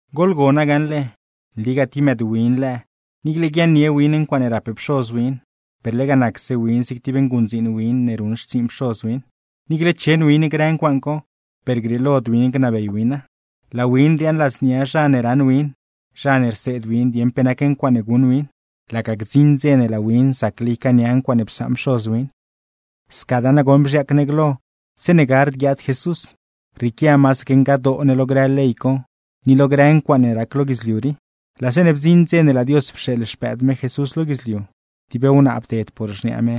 Goḻgona gaṉle, nligaa tib mëëdwin lëë, niicle guiaaṉnie win ncuaaṉe rap pxoz win, per lega nacse win zig tib nguṉdziin win ne ruṉ xtsiiṉ pxoz win. Niicle cheṉ win grë ncuaaṉ co, per grieelod win gnabey wina. Laa win riaaṉ ladznia zha ne raṉ win, zha ne rseed win dieṉ pe nac ncuaaṉe guṉ win, laga gdziṉ dze ne laa win zacle ycaania ncuaaṉe psaṉ pxoz win. Scadaa nagoṉ bzhiaac ne glo zeeṉe gard guiaad Jesús, rrieequia masaque ngadoo ne lo grë ley co, ni lo grëraa ncuaaṉe rac lo guidzliu rii. Laa zeeṉe bdziṉ dze ne laa Dios pxeeḻ Xpëëd me Jesús lo guidzliu (tib wnaa bded por xniaa me,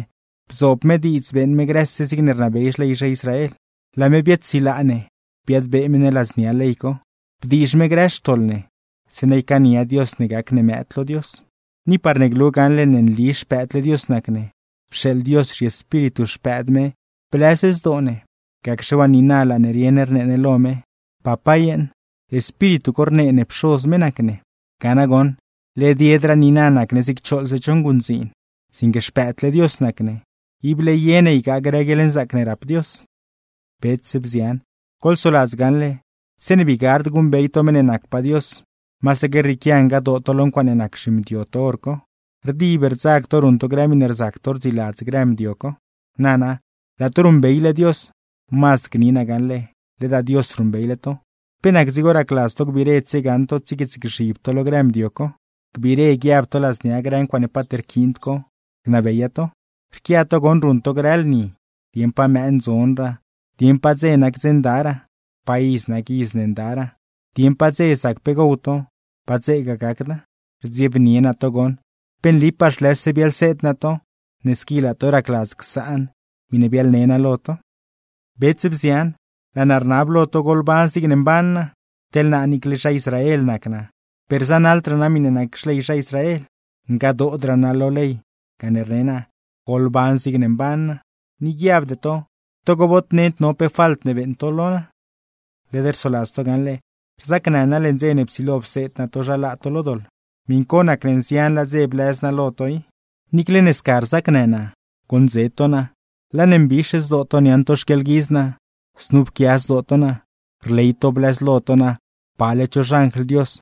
bzoob me diidz beeṉ me grëse zigne rnabey xley zha Israel), laa me biaadsilaa ne, biadbee me ne ladznia ley co, bdiizh me grë xtoḻ ne, zeeṉa ycaania Dios ne gac ne mëëd lo Dios. Ni parne glu gaṉle ne nli xpëëdle Dios nac ne, pxeeḻ Dios zhiEspíritu Xpëëd me blëz zdoo ne; gacxe waa niina laa ne rieṉ rnee ne lo me: “¡Papá yeeṉ!” Espíritu co rnee ne Pxoz ne nac me. Ga nagoṉ, led yedraa niina nac ne zig choḻze cho nguṉdziin, sinque xpëëdle Dios nac ne, ible ye ne ygaa grë guieḻnzaac ne rap Dios. Bets, bzian, goḻsoladz gaṉle, zeeṉe bii gard guṉbey to meṉ ne nacpaa Dios, masaque rrieequia ngadoo to lo ncuaaṉe nac zhimdio to hor co, rdib rdzag to ruṉ to grë miṉe rzac to rdziladz grë mdio co. Nana, laa to ruṉbeyle Dios, mazd gni naa gaṉle ledaa Dios ruṉbeyle to, ¿pe nac dzigo racladz to gbiire tsiegaṉ to, tsiequiitsgzhib to lo grë mdio co, gbiire guiab to ladznia grë ncuaaṉe paat rquiind co, gnabeya to? Rquia to goṉ ruṉ to grë lni, dieṉ pa mëë ndzonraa, dieṉ pa dze nac dze ndaraa, pa iz nac iz ne ndaraa, dieṉ pa dze zac pe gow to, pa dzeegaa gacda. ¡Rdziebnie naa to goṉ! ¡Pe nlipaa zhlëse biaḻseed naa to, ne squi laa to racladz csaan miṉe biaḻne naa lo to! Bets, bzian, laa naa rnab lo to goḻban zigne mban naa, teḻ naa niicle ne zha Israel nac naa per zanaḻdraa naa miṉe nac xley zha Israel. Ngadoodraa naa lo ley, gane rne naa: Goḻban zigne mban naa. Ni guiabde to togo bod nend no pe falt ne beeṉ to lo naa. Led rsoladz to gaṉle, rzacnë naa leṉ dze ne psilo pseed naa to zha laa to lo doḻ; miṉ co nacne nzianlaa dze blëz naa lo to i. Niicle ne sca rzacnë naa, goṉdze to naa; laa ne mbix zdoo to niaṉ to xquieḻguidz naa, znu pquia zdoo to naa, rley to blëzlo to naa pale cho xanjl Dios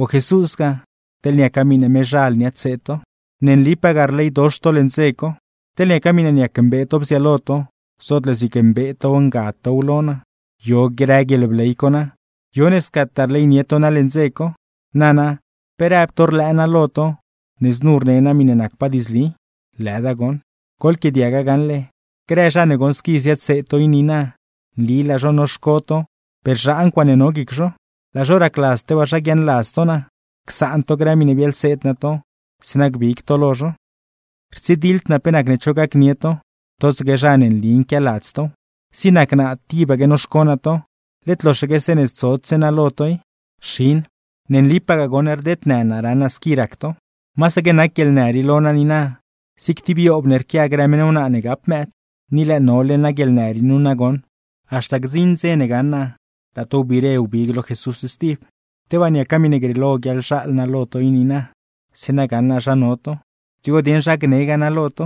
o Jesúsgaa, teḻ niaca miṉe mezhal niaadseed to. ¡Ne nlipagaa rleydox to leṉ dze co! Teḻ niaca miṉe niac mbee to bziaalo to, zootle zig mbee tow ngad tow lo naa. ¿Yo grë guieḻbley co na? ¿Yo ne scataa rleynie to naa leṉ dze co? Nana, pe rëb to rlëë naa lo to ne znu rne naa miṉe nacpaa diidzli. ¡Lëda goṉ! Goḻquiaadiaga gaṉle, grë zha ne goṉ squi ziadseed to i niina, nli laa zho noxco to per zhaa ncuaaṉe no guic zho. Laa zho racladz tebaa zha guiaaṉladz to naa, csaan to grë miṉe biaḻseed naa to, zeeṉa gbig to lo zho. Rtsidiḻd naa pe nacne cho gacnie to, totsaque zha ne nli nquialadz tow. Zig nac naa tibaque noxco naa to, led loxaque zeeṉe zodse naa lo to i. ¡Xin, ne nlipagaa goṉ rdednë naa raṉ naa squi rac to! Masaque nac guieḻnë rii lo naa niina, zig tib yoob ne rquia grë meṉ wnaa ne gap mëëd. Ni lëë nole naa guieḻnë rii nu nagoṉ, haxta gdziṉ dze ne gaṉ naa laa to wbiire wbig lo Jesús stib. Tebaa niaca miṉe grieelo guiaḻzhaal naa lo to i niina, zeeṉa gaṉ naa zha no to, dzigo dieṉ zha gnegaa naa lo to;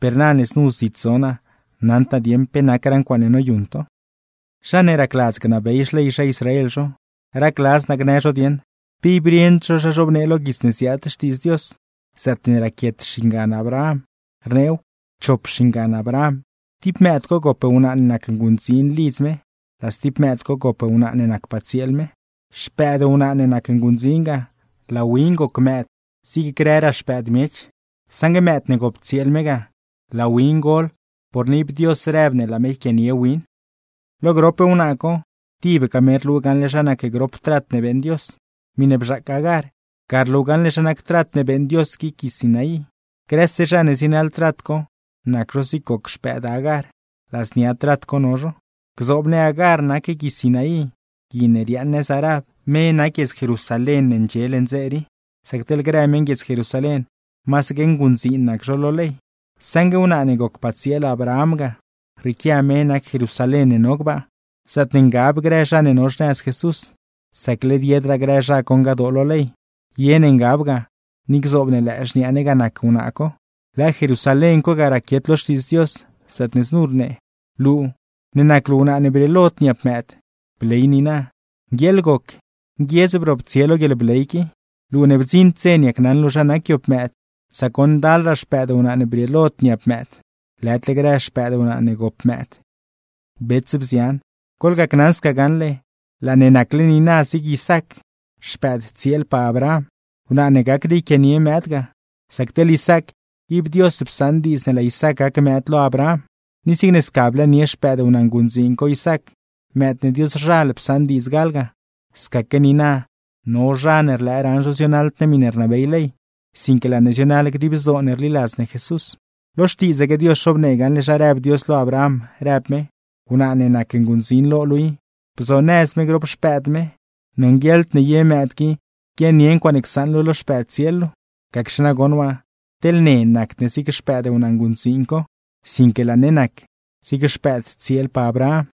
per na ne znu zit zo naa, naṉd naa dieṉ pe nacraa ncuaaṉe noyuṉ to. Zha ne racladz gnabey xley zha Israel zho, racladz naa gnë zho dieṉ, ¿pe ib rieṉd zho zha zhobnee lo guits ne ziaad Xtiidz Dios zaatne raquiet xingan Abraham? Rneew: Chop xingan Abraham, tib mëëd co gop wnaa ne nac nguṉdziin lidz me, laa stib mëëd gop wnaa ne nacpaa tsieel me. Xpëëd wnaa ne nac nguṉdziin ga, laa win goc mëëd zig grëraa xpëëd miech; saṉgue mëëd ne gop tsieel me ga, laa win gol porne ib Dios rëb ne laa me yquianie win. Lo grop wnaa co, tibga me rlu gaṉle zha nac grop trat ne beeṉ Dios: Miṉe bzhaac Agar, ga rlu gaṉle zha nac trat ne beeṉ Dios guic gui Sinaí. Grëse zha ne zienaḻ trat co, nac zho zig goc xpëëd Agar, ladznia trat co no zho. Gzoob ne Agar nac Gui Sinaí, gui ne riaaṉ nëz Arab; me nac guiedz Jerusalén ne ndxie leṉ dze rii, sac teḻ grë meṉguiedz Jerusalén, masaque nguṉdziin nac zho lo ley. Saṉgue wnaa ne gocpaa tsieel Abraham ga, rrieequia me nac Jerusalén ne no gbaa, zaatne ngab grë zha ne no xnëz Jesús, sac led yedraa grë zha co ngadoo lo ley; ye ne ngab ga, ni gzoob ne lëë xniaa ne ga nac wnaa co. Lëë Jerusalén co ga raquiet lo Xtiidz Dios, zaatne znu rnee: Luu, ne nac luu wnaa ne brieelod niap mëëd, bley niina; nguieeḻ goc, nguiedz broptsie lo guieḻbley qui, luu ne bdziṉd dze niacnaṉ luu zha nac yoob mëëd. Sac goṉ ndalraa xpëëd wnaa ne brieelod niap mëëd, lëdle grë xpëëd wnaa ne gop mëëd. Bets, bzian, goḻgacnaṉ sca gaṉle, laa ne nacle niina zig Isaac, xpëëd tsieelpaa Abraham, wnaa ne gacd yquianie mëëd ga; sac teḻ Isaac, ib Dios psaṉ diidz ne laa Isaac gac mëëd lo Abraham. Ni zigne sca blëënie xpëëd wnaa nguṉdziin co Isaac, mëëd ne Dioszhal psaṉ diidz gal ga; scasaque niina, no zha ne rlëë raṉ zho zionaḻd ne miṉe rnabey ley, sinque laa ne zionaḻ dib zdoo ne rliladz ne Jesús. Ni nana, led lo Xtiidzaque Dios zhobnee gaṉle zha rëb Dios lo Abraham, rëb me: “Wnaa ne nac nguṉdziin lo luu i, bzonëz me grop xpëëd me, nonguieḻd ne ye mëëd qui guiaaṉnie ncuaaṉe csaṉ luu lo xpëëd tsieel luu.” Gacxe nagoṉ waa, teḻ ne nacd ne zig xpëëd wnaa nguṉdziin co, sinque laa ne nac zig xpëëd tsieelpaa Abraham.